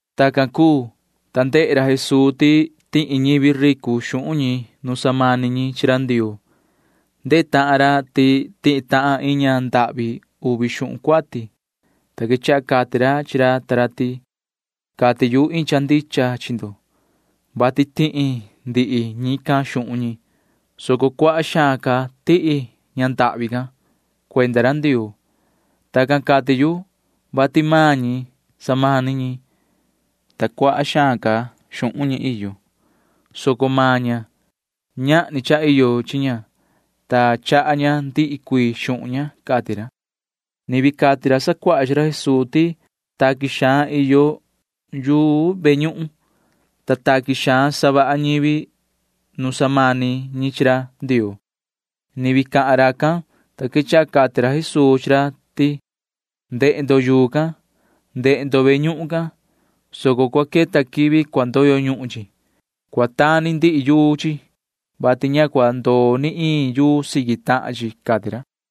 Tacan cuu, ta ndehe ra Jesuu ti tihi ñivi ricu xuhun ñi nu samani ñi chi ra Ndioo. Ndehe tahan ra ti tihi tahan iin ña ndahvi uvi xuhun cuati, ta quechaha cati ra chi ra ta ra ti: ―Cati yu iin cha ndicha chi ndo, vati tihi ndihi ñican xuhun ñi, soco cuaha xaan ca tihi ña ndahvi can [cuenda ra Ndioo]. Tacan cati yu, vati maan ñi samani ñi, ta cuaha xaan ca xuhun ñi iyo, soco maan ña―ñahni cha iyo chi ña, ta chaha ña ndihi cuii xuhun ña ―cati ra. Ni vii cati ra sacuaha chi ra Jesuu ti taqui xaan iyo yuu ve ñuhun, ta taqui xaan savaha ñivi nu samani ñi chi ra Ndioo. Ni vii cahan racan, ta quechaha cati ra Jesuu chi ra ti: ―Ndehe ndo yuu can. Ndehe ndo ve ñuhun can, soco cua queta quivi cua ndoyo ñuhun chi. Cua tani ndihi yuu chi, vati ña cua ndoo ni iin yuu siqui tahan chi ―cati ra.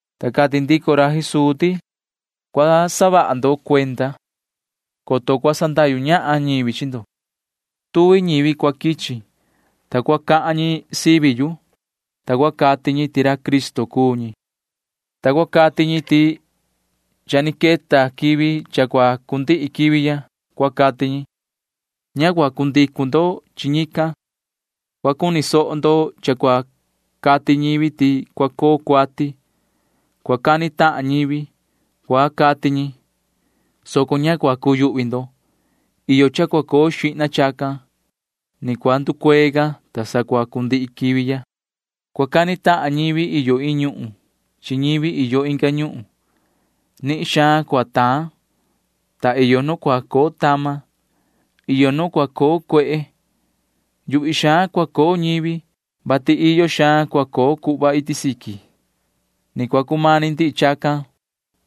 Ta cati ndico ra Jesuu ti: ―Cua saha ndo cuenda, coto cua sandahyu ñahan ñivi chi ndo. Tuvi ñivi cua quichi, ta cua cahan ñi sivi yu, ta cua cati ñi ti ra Cristo cuu ñi, ta cua cati ñi ti cha ni queta quivi cha cua cundihi quivi ya, cua cati ñi. Ña cua cundicu ndo chi ñican. Cua cuni soho ndo cha cua cati ñivi ti cua coo cuati. Cua cani tahan ñivi, cua cati ñi, soco ña cua cuyuhvi ndo. Iyo cha cua coo xihna chacan. Ni cua nducuee ca, ta sa cua cundihi quivi ya. ’Cua cani tahan ñivi iyo iin ñuhun chi ñivi iyo inga ñuhun. Nihin xaan cua taan, ta iyo nu cua coo tama. Iyo nu cua coo cuehe. Yuhvi xaan cua coo ñivi, vati iyo xaan cua coo cuhva iti siqui. ’Ni cua cumani ndihi chacan,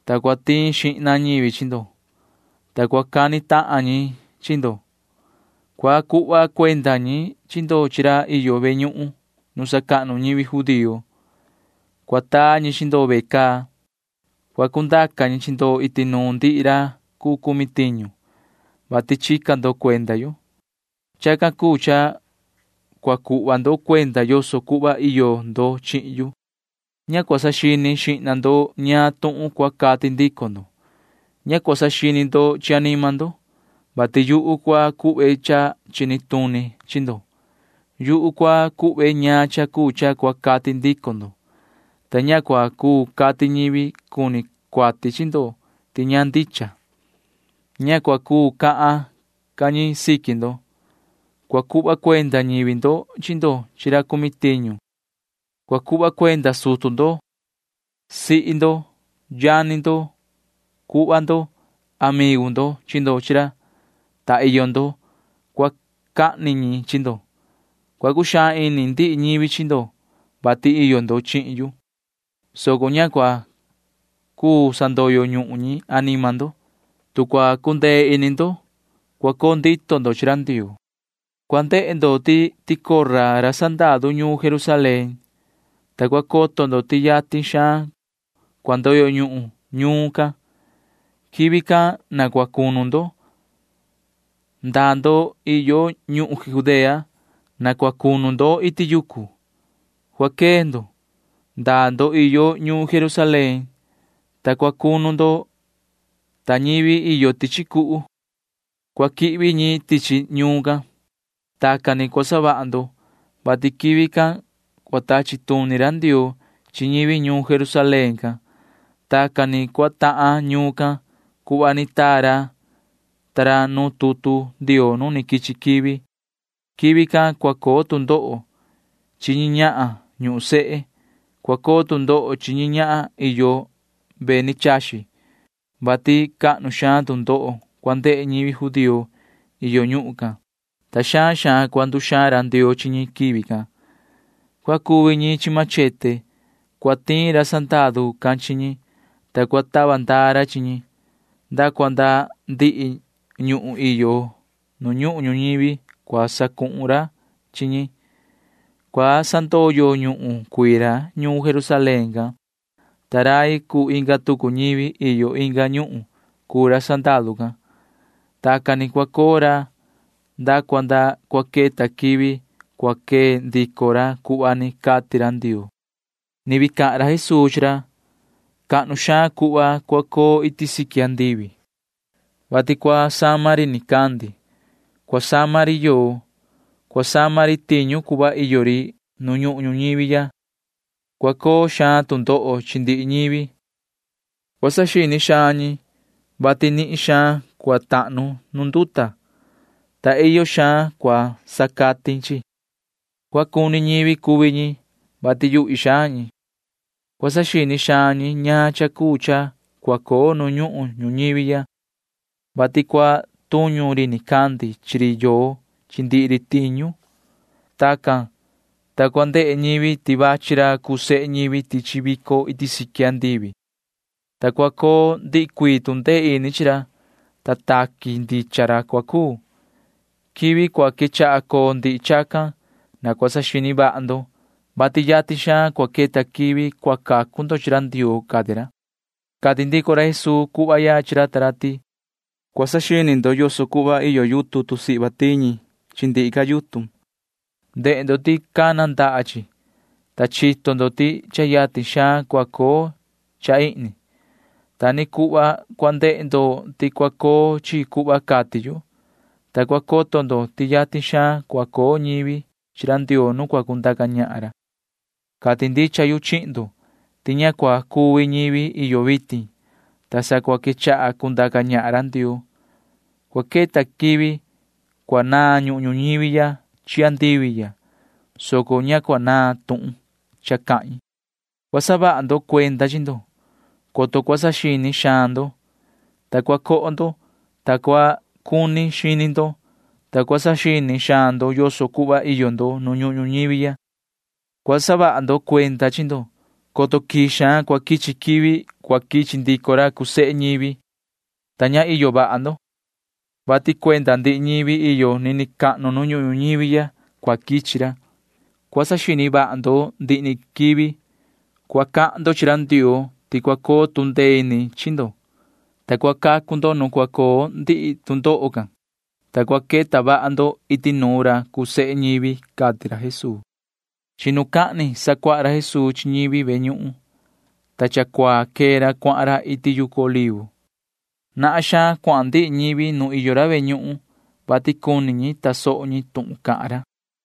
ta cua tiin xihna ñivi chi ndo, ta cua cani tahan ñi chi ndo. Cua cuhva cuenda ñivi chi ndo chi ra iyo ve ñuhun nu sacahnu ñivi judío. Cua taa ñi chi ndo ve caa. Cua cundaca ñi chi ndo iti nuun ndihi ra cuu cumi tiñu, vati chica ndo cuenda yu. Chacan cuu cha cua cuhva ndo cuenda yoso cuhva iyo ndo chihin yu. Ña cua saxini xihna ndo ñaan tuhun cua cati ndico ndo. Ña cua saxini ndo chi anima ndo, vati yuhu cua cuhve cha chini tuni chi ndo. Yuhu cua cuhve ñaan cha cuu cha cua cati ndico ndo, ta ña cua cuu cati ñivi cuni cuati chi ndo ti ña ndicha. Ña cua cuu cahan ca ñi siqui ndo. Cua cuhva cuenda ñivi ndo chi ndo chi ra cumi tiñu. Cua cuhva cuenda sutu ndo, sihi ndo, yani ndo, cuhva ndo, amigu ndo chi ndo chi ra, ta iyo ndo―cua cahni ñi chi ndo. Cua cuxaan ini ndihi ñivi chi ndo, vati iyo ndo chihin yu, soco ña cua cuu sandoyo ñuhun ñi anima ndo. Tu cua cundee ini ndo, cua coo ndito ndo chi ra Ndioo. ’Cua ndehe ndo ti cua ticora ra sandaru ñuun Jerusalén, ta cua coto ndo ti yatin xaan cua ndoyo ñuhun ñuun can. Quivi can na cua cunu ndo―ndaa ndo iyo ñuhun Judea. Na cua cunu ndo iti yucu. Cua quee ndo―ndaa ndo iyo ñuun Jerusalén, ta cua cunu ndo, ta ñivi iyo tichi cuhu―cua quihvi ñi tichi ñuun can. Tacan ni cua savaha ndo, vati quivi can cua tachi tuni ra Ndioo chi ñivi ñuun Jerusalén can. Tacan ni cua tahan ñuun can cuhva ni taa ra ta ra nu tutu Ndioo nu ni quichi quivi. Quivi can cua coo tu ndoho chi ñi ñahan ñuhun sehe. Cua coo tu ndoho chi ñi ñahan iyo ve ni chaxi, vati cahnu xaan tu ndoho cua ndehe ñivi judío iyo ñuhun can, ta xaan xaan cua nduxaan ra Ndioo chi ñi quivi can. Cua cuvi ñi chi machete. Cua tiin ra sandaru can chi ñi, ta cua tava ndaa ra chi ñi. Nda cua nda ndihi ñuhun iyo nu ñuhun ñuñivi cua sacuhun ra chi ñi. Cua sandoyo ñuhun cuii ra ñuun Jerusalén can, ta rai cuu inga tucu ñivi iyo inga ñuhun cuu ra sandaru can. Tacan ni cua coo ra nda cua nda cua queta quivi cua quee ndico ra cuhva ni cati ra Ndioo. [Ni vii cahan ra Jesuu chi ra:] ’Cahnu xaan cuhva cua coo iti siqui andivi, vati cua sama ri nicandi, cua sama ri yoo, cua sama ri tiñu cuhva iyo ri. Nu ñuhun ñuñivi ya cua coo xaan tu ndoho chi ndihi ñivi. Cua saxini xaan ñi, vati nihin xaan cua tahnu nu nduta, ta iyo xaan cua sacatin chi. Cua cuni ñivi cuvi ñi, vati yuhvi xaan ñi. Cua saxini xaan ñi ñaan cha cuu cha cua coo nu ñuhun ñuñivi ya, vati cua tuñu ri nicandi chi ri yoo chi ndihi ri tiñu. Tacan, ta cua ndehe ñivi ti vachi ra cuu sehe ñivi tichi vico iti siqui andivi, ta cua coo ndihi cuii tu ndee ini chi ra, ta taqui ndicha ra cua cuu. Quivi cua quechaha coo ndihi chacan na cua saxini vaha ndo, vati yatin xaan cua queta quivi cua cacu ndo chi ra Ndioo ―cati ra. Cati ndico ra Jesuu cuhva ya chi ra ta ra ti: ―Cua saxini ndo yoso cuhva iyo yutun tusihva tiñi chi ndihi ca yutun. Ndehe ndo ti cana ndaha chi, ta chito ndo ti cha yatin xaan cua coo cha ihni. Ta ni cuhva cua ndehe ndo ti cua coo chi cuhva cati yu, ta cua coto ndo ti yatin xaan cua coo ñivi chi ra Ndioo nu cua cundaca ñahan ra. ’Cati ndicha yu chihin ndo ti ña cua cuvi ñivi iyo vitin, ta sa cua quechaha cundaca ñahan ra Ndioo. Cua queta quivi cua naan ñuhun ñuñivi ya chi andivi ya, soco ña cua naan tuhun cha cahin. ’Cua saha vaha ndo cuenda chi ndo, coto cua saxini xaan ndo, ta cua coho ndo, ta cua cuni xini ndo, ta cua saxini xaan ndo yoso cuhva iyo ndo nu ñuhun ñuñivi ya. Cua saha vaha ndo cuenda chi ndo, coto quii xaan cua quichi quivi cua quichi ndico ra cuu sehe ñivi, ta ña iyo vaha ndo, vati cuenda ndihi ñivi iyo nini cahnu nu ñuhun ñuñivi ya cua quichi ra. Cua saxini vaha ndo ndihi ni quivi. Cua cahan ndo chi ra Ndioo ti cua coo tu ndee ini chi ndo, ta cua cacu ndo nu cua coo ndihi tu ndoho can, ta cua queta vaha ndo iti nuun ra cuu sehe ñivi ―cati ra Jesuu. Chinucahni sacuaha ra Jesuu chi ñivi ve ñuhun, ta cha cuaa quee ra cuahan ra iti yucu Olivo. Nahan xaan cuahan ndihi ñivi nu iyo ra ve ñuhun, vati cuni ñi tasoho ñi tuhun cahan ra.